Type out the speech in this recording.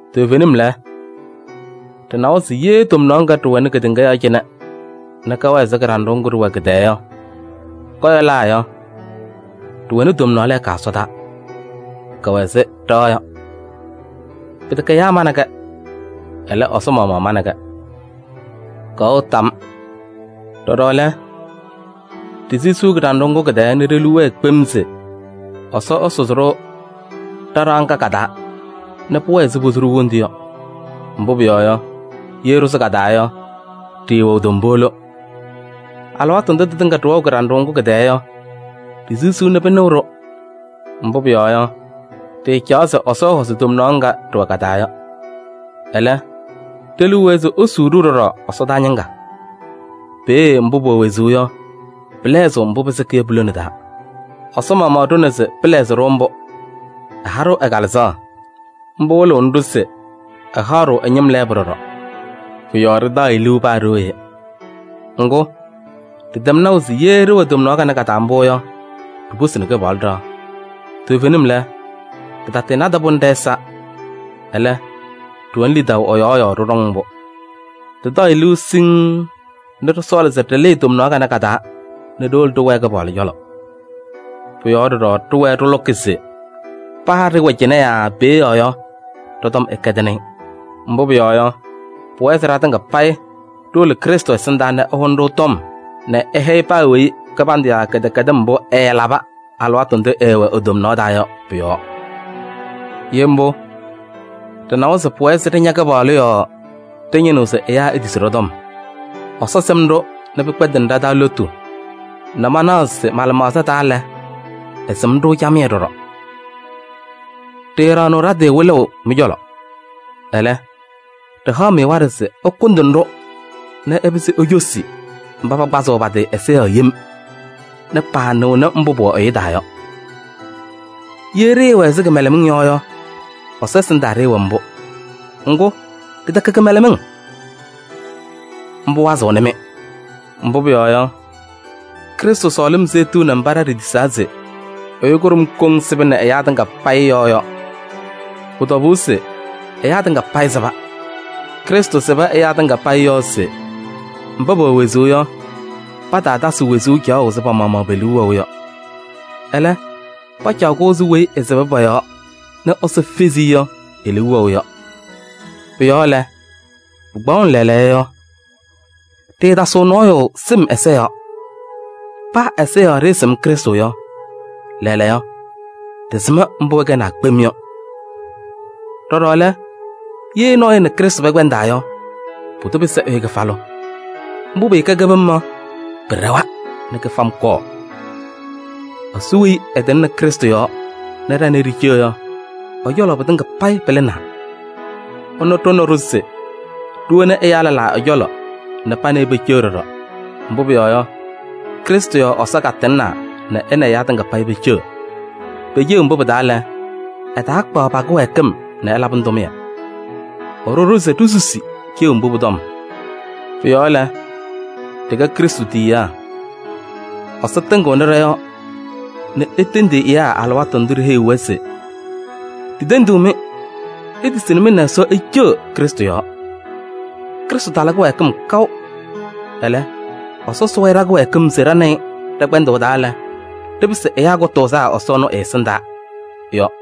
Toovenim lɛ, ɖɩnawa se ye tomnaɣ ŋga ɖɩwɛnɩ kedeŋa yɔɔ cɩnɛ nɛ kɛwɛ ɛzɩ kɩɖanɖʋʋ ŋgʋ ɖɩwɛ kɩ-tɛɛ yɔ, kɔyɔlaa yɔ, ɖɩwɛnɩ tomnaɣ lɛɛka ɛsɔdaa, kɛwɛ ɛzɩ ɖɩɣa yɔ. Pɩtɛkɛ ɛyaa manɩ-kɛ, ɛlɛ, Ɛsɔ maɣmaɣ manɩ-kɛ. Kɛwɛɣ tam. Ɖɔɖɔ lɛ, ɖisisiɣ kɩɖanɖʋʋ ŋgʋ kɩ-tɛɛ nɛ ɖe-liu wɛɛ kpem se Ɛsɔ ɛsʋzɩ-ɖʋ ɖa-ɖɩɣa ŋga ka-taa nɛ pʋwɛɛ ɛzɩ posu-ɖʋ wondu yɔ. Mbʋ pʋyɔɔ yɔ, ye ɖɩsʋ ka-taa yɔ, ɖɩɩwɛɣ tombolo. Alɩwaatʋ ndʋ tɩtɩŋa ɖɩwɛɣ kɩɖanɖʋʋ ŋgʋ kɩ-tɛɛ yɔ, ɖisisiɣ nɛ pɩnɩɣ-ɖʋ. Mbʋ pʋyɔɔ yɔ, ɖɩɩcaɣ se Ɛsɔ ɛhɔzɩ tomnaɣ ŋga ɖɩwɛ ka-taa yɔ. Ɛlɛ, ɖe-liu wɛɛ se esuu-ɖʋ ɖɔɖɔ ɛsɔdaa ñɩŋga. Peeye mbʋ pʋwɛ wezuu yɔ, pɩlɛɣzɩɣ mbʋ pɩsɩkɩ yɔ pu-lone taa. Ɛsɔ maɣmaɣ ɖʋna se pɩlɛɣzɩ-ɖʋ mbʋ. Ɛha-ɖʋ ɛ-Kalɩzaɣ. Mbʋ wɩlɩɣnɩ-ɖʋ se ɛhaɣ-ɖʋ ɛ-ñɩm lɛɛbʋ ɖɔɖɔ. Pʋ-yɔɔ ɖɩtaɣ-ɩ liu paa ɖooye. Ŋgʋ, ɖɩtɛm naʋ se ye ɖɩwɛ tomnaɣ kanɛ ka-taa mbʋ yɔ, ɖiposini Kɩpaɣlʋ ɖɩɣa. Toovenim lɛ, ɖɩtanadɩ-pʋ nɛ ɖɛ-ɛza, ɛlɛ, ɖɩwɛnɩ lidaʋ ɛ-yɔɔ yɔɔ ɖɩɖɔŋ mbʋ. Ɖɩtaɣ-ɩ liu siŋŋ nɛ ɖɩsɔɔlɩ se ɖɩlɩɩ tomnaɣ kanɛ ka-taa nɛ ɖiwolo ɖɩwɛɛ Kɩpaɣlʋ cɔlɔ. Pʋ-yɔɔ ɖɔɖɔ ɖɩwɛɛ ɖɩlʋkɩ se paa ɖɩɩwɛ cɩnɛ yaa peeye yɔ yɔ, ɖɔ-tɔm ɛkɛdɩnɩ-ɩ. Mbʋ pʋyɔɔ yɔ, pʋwɛɛ se ɖatɩŋa payɩ ɖiwolo Krɩstʋ ɛsɩndaa nɛ ɛhʋnɩ-ɖʋ tɔm nɛ ɛhɛyɩ paa weyi kɩbandʋ yaa kɩdɛkɛdɩm mbʋ ɛɛlabɩ alɩwaatʋ ndʋ ɛɛwɛ e-tomnaɣ taa yɔ pʋ-yɔɔ. Ye mbʋ, ɖɩnawa se pʋwɛɛ se ɖɩña Kɩpaɣlʋ yɔɔ ɖɩñɩnɩɣ se ɛyaa etisi ɖɔ-tɔm. Ɛsɔ sɩm-ɖʋ nɛ pɩkpɛndɩnɩ ɖa-taa lotu nɛ manaɣ se mɩ-lɩmaɣza taa lɛ, ɩsɩm-ɖʋ camɩyɛ ɖɔɖɔ. Ɖɩɩɖaɣnɩɣ ɖa-tɩ wɩlʋʋ mɩ-cɔlɔ. Ɛlɛ, ɖɩhaɣ-mɩ waɖɛ se ɩkʋndɩnɩ-ɖʋ nɛ ɩpɩzɩ icosi mba pakpazɩɣ pa-tɩ ɛza yɔɔ yem nɛ paanɩɣnɩ mbʋ pʋwɛ ɛyʋ taa yɔ. Ye ɖɩɩwɛ ɛzɩ kɩmɛlɛmɩŋ yɔ yɔ, Ɛsɔ ɛsɩndaa ɖɩɩwɛ mbʋ. Ŋgʋ, ɖɩtɛkɛ kɩmɛlɛmɩŋ. Mbʋ wazɩɣnɩ-mɩ. Mbʋ pʋyɔɔ yɔ, Krɩstʋ sɔɔlɩm seɣtiɣni mba ɖa ɖitisaa se: ɛyʋ kʋɖʋm koŋ sɩbɩnɩ ɛyaa tɩŋa payɩ yɔɔ yɔ. Pʋ-tɔbʋʋ se ɛyaa tɩŋa payɩ sɩba. Krɩstʋ sɩbɩ ɛyaa tɩŋa payɩ yɔɔ se mba pɛwɛ wezuu yɔ, pataatasɩ wezuu caɣʋ ɛzɩ pa-maɣmaɣ pe-liu wɛʋ yɔ. Ɛlɛ, pacaɣ-kʋ ɛzɩ weyi ɛsɩbɩ pɔ-yɔɔ nɛ Ɛsɔ fezi-i yɔ, e-liu wɛʋ yɔ. Pʋ-yɔɔ lɛ, pɩkpaɣʋnɩ lɛɛlɛɛyɔ yɔ, ɖɩɩtasɩɣ nɔɔyʋ sɩm ɛza yɔɔ. Paa ɛza yɔɔ ɖɩɩsɩm Krɩstʋ yɔ, lɛɛlɛɛyɔ, ɖɩsɩm mbʋ ɛkɛwa kpem yɔ. Ɖɔɖɔ lɛ, ye nɔɔyʋ nɛ Krɩstʋ pɛkpɛndaa yɔ, pʋdʋ pɩsɩ ɛyʋ kɩfalʋ. Mbʋ pɩɩkɛ kɩbɩm yɔ, pɩɖɛwa nɛ kɩfam kɔɔ. sɔ weyi ɛtɩŋnɩ Krɩstʋ yɔɔ nɛ ɖa nɛ ɩ ɖiceɣ yɔ, ɛ-cɔlɔ pɩtɩŋa payɩ pɩlɩnaa. Ɛnʋ ɖʋnɩ-ɖʋ se ɖiwoni ɛyaa lɛlaa ɛ-cɔlɔ nɛ pa nɛ ɩ peceɣ ɖɔɖɔ. Mbʋ pʋyɔɔ yɔ, Krɩstʋ yɔɔ Ɛsɔ katɩŋnaa nɛ ɛ nɛ ɛyaa tɩŋa payɩ peceɣ. Pe-ceɣu mbʋ pɩ-taa lɛ, ɛtaakpaɣ pa-kɩwɛɛkɩm nɛ ɛlabɩnɩ tʋmɩyɛ. Ɛɖʋ-ɖʋ se ɖisusi ceɣu mbʋ pʋ-tɔm. Pʋ-yɔɔ lɛ, ɖɩkɛ Krɩstʋ tiyiyaa. Ɛsɔ tɩŋɩɣnɩ ɖɔ-yɔɔ nɛ etendiɣ ɛyaa alɩwaatʋ ndʋ ɖiheyiɣ-wɛ se: “Ɖitendiɣ-mɩ, itisi nɛ mɩ nɛ Ɛsɔ iceɣ Krɩstʋ yɔɔ. Krɩstʋ tala kɩwɛɛkɩm kaʋ. Ɛlɛ, Ɛsɔ sʋʋ-ɩ ɖa-kɩwɛɛkɩm se ɖa nɛ ɩ ɖɛ-kpɛndʋʋ taa lɛ, ɖɩpɩsɩ ɛyaa kʋtʋʋzaa Ɛsɔ ɛnʋ ɛ-ɛsɩndaa” yɔ.